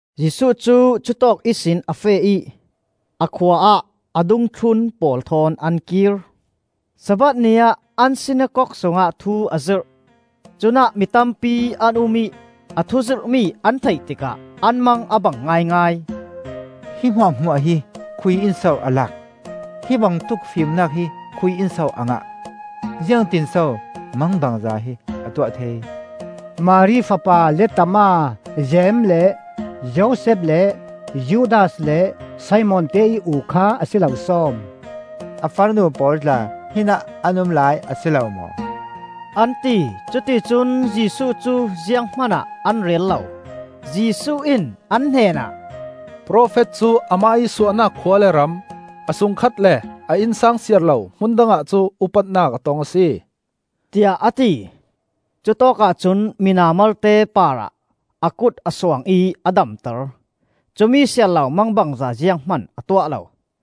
Jesuh cu cutawk ihsin a feh ih a khua ah a dungthlun pawl thawn an kir. Sabbath ni ah an sinakok sungah thu a zirh. Cunah mi tampi an um ih a thuzirhmi an theih tikah an mang a bang ngaingai. “Hi hmuahhmuah hi khuiinso a lak? Hi bangtuk fimnak hi khuiinso a ngah? Ziangtin so mangbangza hi a tuah thei? Mari fapa lettama, Jeim le Josef le Judas le Simon teih u kha a si lo sawm? A farnu pawl tla hinah an um lai a si lo maw?” an ti. Cuticun Jesuh cu zianghman ah an rel lo. Jesuh in ah hnenah, “Profet cu amah ih suahnak khua le ram, a sungkhat le a innsang siar lo hmun dangah cuh upatnak a tong a si,” tiah a ti. Cutawkah cun mina malte parah a kut a suang ih a damter; cumi siar lo mangbangza zianghman a tuah lo.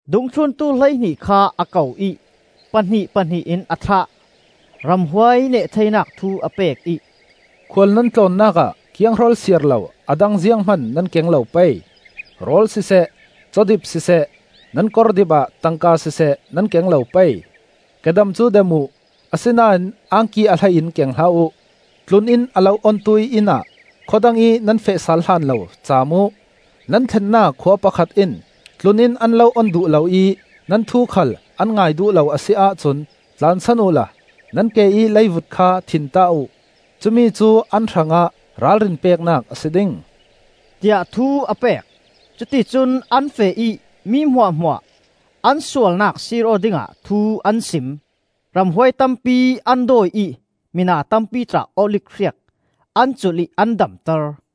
Dungthluntu hleihnih kha a ko ih pahnih pahnih in a thlah. Ramhuai neh theinak thu a pek ih, “Khual nan tlawnnak ah kianghrol siar lo a dang zianghman nan keng lo pei: rawl siseh, cawdip siseh, nan kordip ah tangka siseh nan keng lo pei. Kedam cu dam uh, asinain angki a hlei in keng hlah uh. Tlun-inn a lo ontu ih inn ah khua dangih nan feh sal hlan lo caam uh. Nan thlennak khua pakhat in, tlun-inn an lo on duh lo ih nan thu khal an ngai duh lo a si ahcun, tlansan uhla nan ke ih leivut kha thinta uh. Cumi cu an hrangah ralrin peknak a si ding,” tiah thu a pek. Cuticun an feh ih mi hmuahhmuah an sualnak sir aw dingah thu an sim. Ramhuai tampi an dawi ih mina tampi tla olif hriak an culh ih an damter.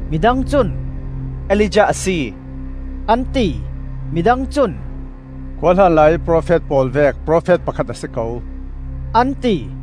Mi dang cun, “Elijah a si,” an ti. Mi dang cun, “Khuahlan laiih profet pawl vek profet pakhat a si ko,” an ti.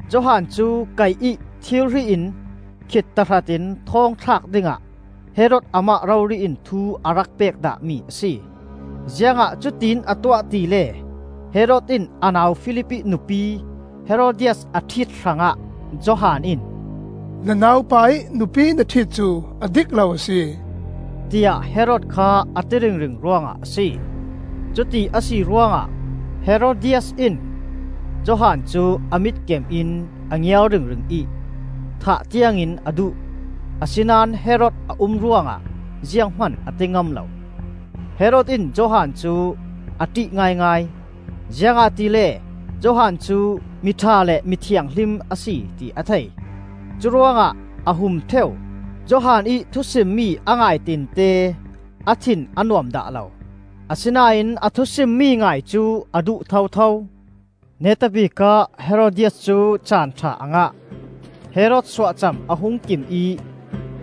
Johan cu kaih ih thirhri in khit tahratin thawng thlak dingah Herod amah rori in thu a rak pek dahmi a si. Ziangah cutin a tuah tile, Herod in a nau Filip ih nupi Herodias a ṭhit hrangah, Johan in, “Na naupa ih nupi na ṭhit cu a dik lo a si,” tiah Herod kha a ti ringring ruangah a si. Cuti a si ruangah Herodias in Johan cu a mitkem in a ngiar ringring ih thah tiangin a duh; a sinan Herod a um ruangah zianghman a ti ngam lo. Herod in Johan cu a ṭih ngaingai, ziangahtile Johan cu mi ṭha le mi thianghlim a si ti a thei. Curuangah a hum ṭheu. Johan ih thusimmi a ngaitinte a thin a nuam dah lo, asinain a thusimmi ngai cu a duh thotho. Neta bikah Herodias cu caan ṭha a ngah. Herod suahcam a hung kim ih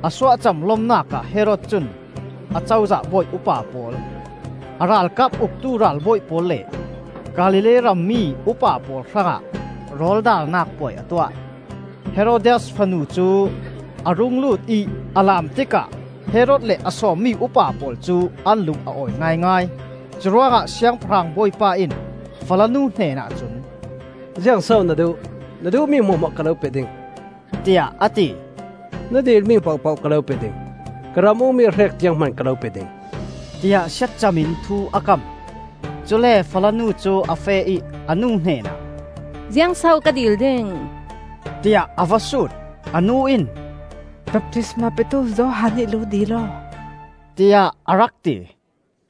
a suahcam lomnak ah Herod cun Acozah bawi upa pawl, a ralkap uktu ralbawi pawl le Galilee rammi upa pawl hrangah rawl darnak puai a tuah. Herodias fanu cu a rung lut ih a laam tikah Herod le a sawmmi upa pawl cu an lung a awi ngaingai. Curuangah Siangpahrang bawipa in falanu hnenah cun, “Ziang so na duh? Na duh mi hmuahhmuah ka lo pe ding,” tiah a ti. “Na dilmi pohpoh ka lo pe ding; ka ram ukmi a hrek tiang hman ka lo pe ding,” tiah siatcam in thu a kam. Cule falanu cu a feh ih a nu hnenah, “Ziang so ka dil ding?” tiah a va sut. A nu in, “Baptisma petu Johan ih lu dil aw,” tiah a rak ti.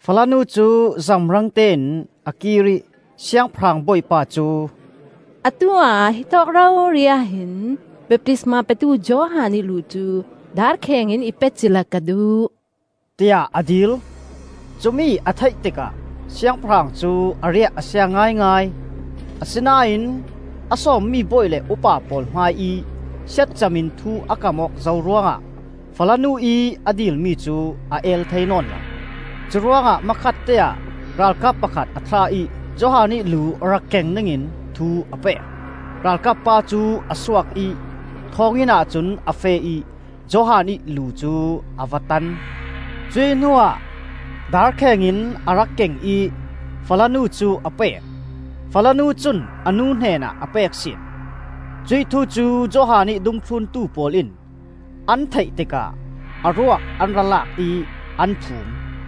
Falanu cu zamrang tein a kir ih Siangpahrang bawipa cu, “Atu ah hitawk rori ah hin baptisma petu Johan ih lu cu darkheng in i pe cila ka duh!” tiah a dil. Cumi a theih tikah Siangpahrang cu a riah a sia ngaingai, asinain a sawmmi bawi le upa pawl hmaiih siatcam in thu a kam awk zo ruangah falanu ih a dilmi cu a el thei nawn lo. Curuangah hmakhatte ah ralkap pakhat a thlah ih Johan ih lu rak keng dingin thu a pek. Ralkap pa cu a suak ih thawnginn ahcun a feh ih Johan ih lu cu a va tan. Cuih hnuah darkheng in a rak keng ih falanu cu a pek, falanu cun a nu hnenah a pek sin. Cuih thu cu Johan ih dungthluntu pawl in an theih tikah a ruak an ra lak ih an phum.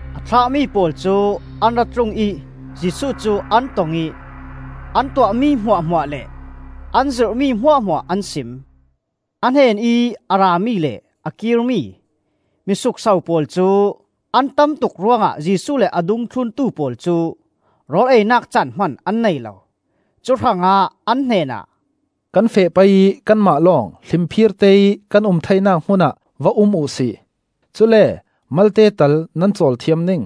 A thlahmi pawl cu an ra tlung ih Jesuh cu an tong ih an tuahmi hmuahhmuah le an zirhmi hmuahhmuah an sim. A hnenih a rami le a kirmi, mi sukso pawl cu an tamtuk ruangah Jesuh le a dungthluntu pawl cu rawl einak caan hman an nei lo. Cu hrangah an hnenah, “Kan feh pei ih kanmah lawng hlimphirte ih kan um theinak hmunah va um uh si; cule malte tal nan cawl thiam ding,”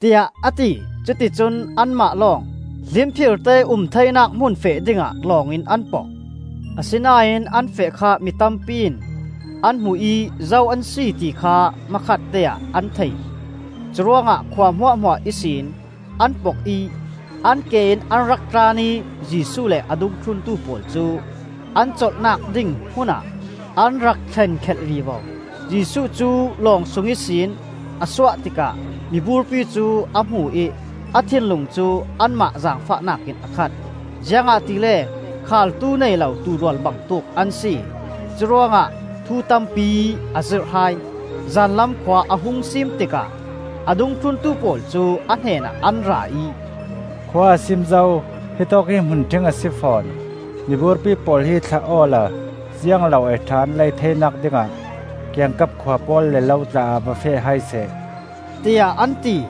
tiah a ti. Cuticun anmah lawng hlimphirte ih um theinak hmun feh dingah lawng in an pok. Asinain an feh kha mi tampi in an hmu ih zo an si ti kha hmakhatte ah an thei. Curuangah khua hmuahhmuah ihsin an pok ih an ke in an rak tlan ih Jesuh le a dungthluntu pawl cu an colhnak ding hmunah an rak thlen khelh vivo. Jesuh cu lawng sung ihsin a suah tikah miburpi cu a hmu ih a thinlung cu anmah zaangfahnak in a khat, ziangahtile khaaltu nei lo tuurual bangtuk an si. Curuangah thu tampi a zirh hai. Zanlam khua a hung siim tikah a dungthluntu pawl cu a hnenah an ra ih, “Khua a siim zo; hitawk hi hmunṭhing a si fawn. Miburpi pawl hi thlah awla ziang lo ei ṭha an lei theinak dingah kiangkap khua pawl le lo tla ah va feh hai seh,” tiah an ti.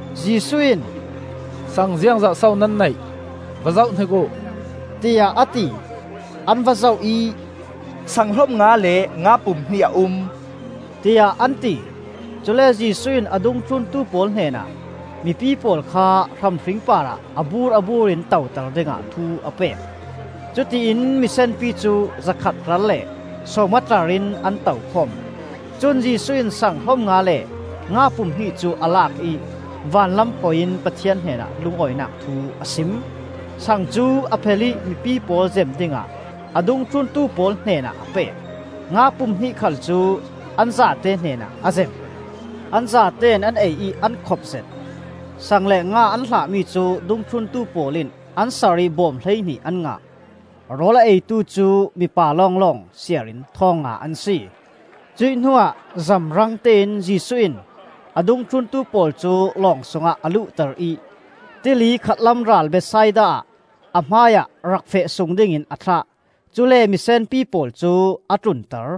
Jesuh in, “sang ziangzat so nan neih? Va zohhnik uh,” tiah a ti. An va zoh ih, “sang hlom nga le nga pum hnih a um,” tiah an ti. Cule Jesuh in a dungthluntu pawl hnenah mipi pawl kha hram hring parah a bur a bur in toter dingah thu a pek. Cutiin misenpi cu zakhat tlar le sawmnga tlar in an to khawm. Cun Jesuh in sang hlom nga le nga pum hnih cu a lak ih vanlam hawi in Pathian hnenah lungawinak thu a sim. Sang cu a phel ih mipi pawl zem dingah a dungthluntu pawl hnenah a pek. Nga pum hnih khal cu an zate hnenah a zem. An zatein an ei ih an khopzet. Sang le nga an hlahmi cu dungthluntu pawl in an sar ih bawm hleihnih an ngah. Rawl a eitu cu mipa lawnglawng siar in thawng nga an si. Cuih hnuah zamrangte in Jesuh in a dungthluntu pawl cu lawng sungah a luhter ih tili khatlam ral Bethsaida ah a hmaiah rak feh sung dingin a thlah. Cule misenpi pawl cu a tlunter.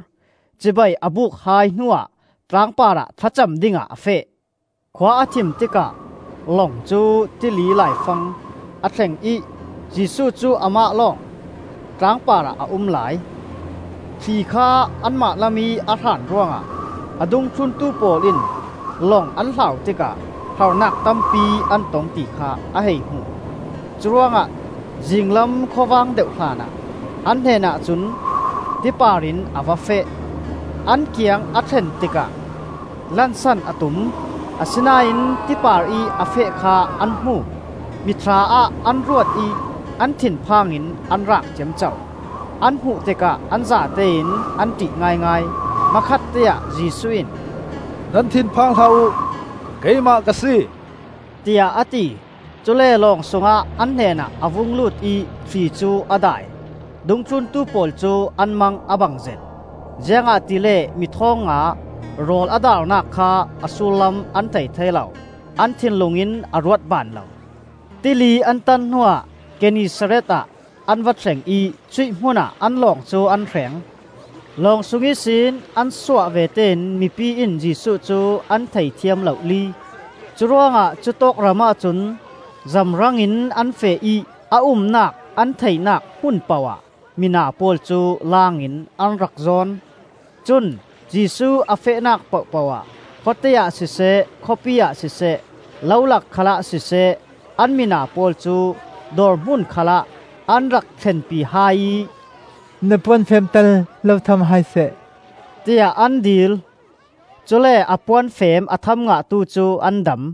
Cibai a buk hai hnuah tlang parah thlacam dingah a feh. Khua a thim tikah lawng cu tili laifang a thleng ih Jesuh cu amah lawng tlang parah a um lai. Thli kha anmah lamih a hran ruangah a dungthluntu pawl in lawng an hlau tikah harnak tampi an tong ti kha a hei hmu. Curuangah zinglam khawvang deuh hlanah an hnenah cun ti parin a va feh. An kiang a thlen tikah lansan a tum, asinain ti parih a feh kha an hmu. Mithla ah an ruat ih an thin phangin an raak ciamco. An hmuh tikah an zatein an ṭih ngaingai. Hmakhatteah Jesuh in, “Nan thinphang hlah uh! Keimah ka si,” tiah a ti. Cule lawng sungah an hnenah a vung lut ih thli cu a dai. Dungthluntu pawl cu an mang a bangzet, ziangahtile mi thawng nga rawl a daarnak kha a sullam an thei thei lo, an thinlung in a ruat ban lo. Tili an tan hnuah Gennesaret ah an va thleng ih cuih hmunah an lawng cu an hreng. Long sung ihsin an suah vete in mipi in Jesuh cu an theithiam lohli. Curuangah cutawk ramah cun zamrangin an feh ih a umnak an theihnak hmun poh ah mina pawl cu laang in an rak zawn. Cun Jesuh a fehnak pohpoh ah khawte ah siseh, khawpi ah siseh, lo lak khalah siseh, an mina pawl cu dawrhmun khalah an rak thlenpi hai ih, “Na puanfeem tal lo tham hai seh,” tiah an dil; cule a puanfeem a tham ngahtu cu an dam.